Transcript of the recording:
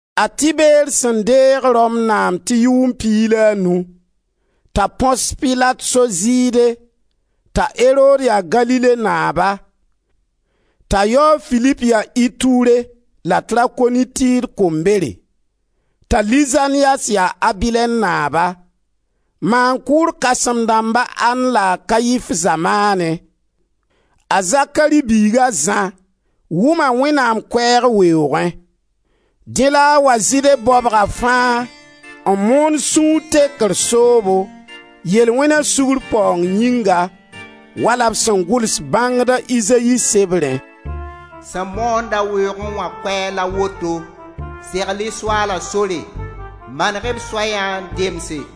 A Tiber sẽn deeg Rom naam tɩ yʋʋm piig la a nu, t'a Põs Pilat so Zɩɩde, t'a Erod ya Galile naaba, t'a yao, a Filip, ya Iture la Trakonitid kombere, t'a Lizanias ya Abilɛn naaba, maan-kʋʋr kãsẽm-dãmb a An la a Kaif zamaanẽ, a Zakari biig a Zã, wʋma Wẽnnaam koɛɛg weoogẽ. Dẽ la a wa Zɩɩde baobga fãa n moon sũur tekr soobo, yel-wẽna sugr paoong yĩnga, wala b sẽn gʋls bãngd a Izayi sebrẽ: «Sẽn moond-a weoogẽ wã koɛɛg la woto: segl-y Soaala sore, maneg-y b soya n demse!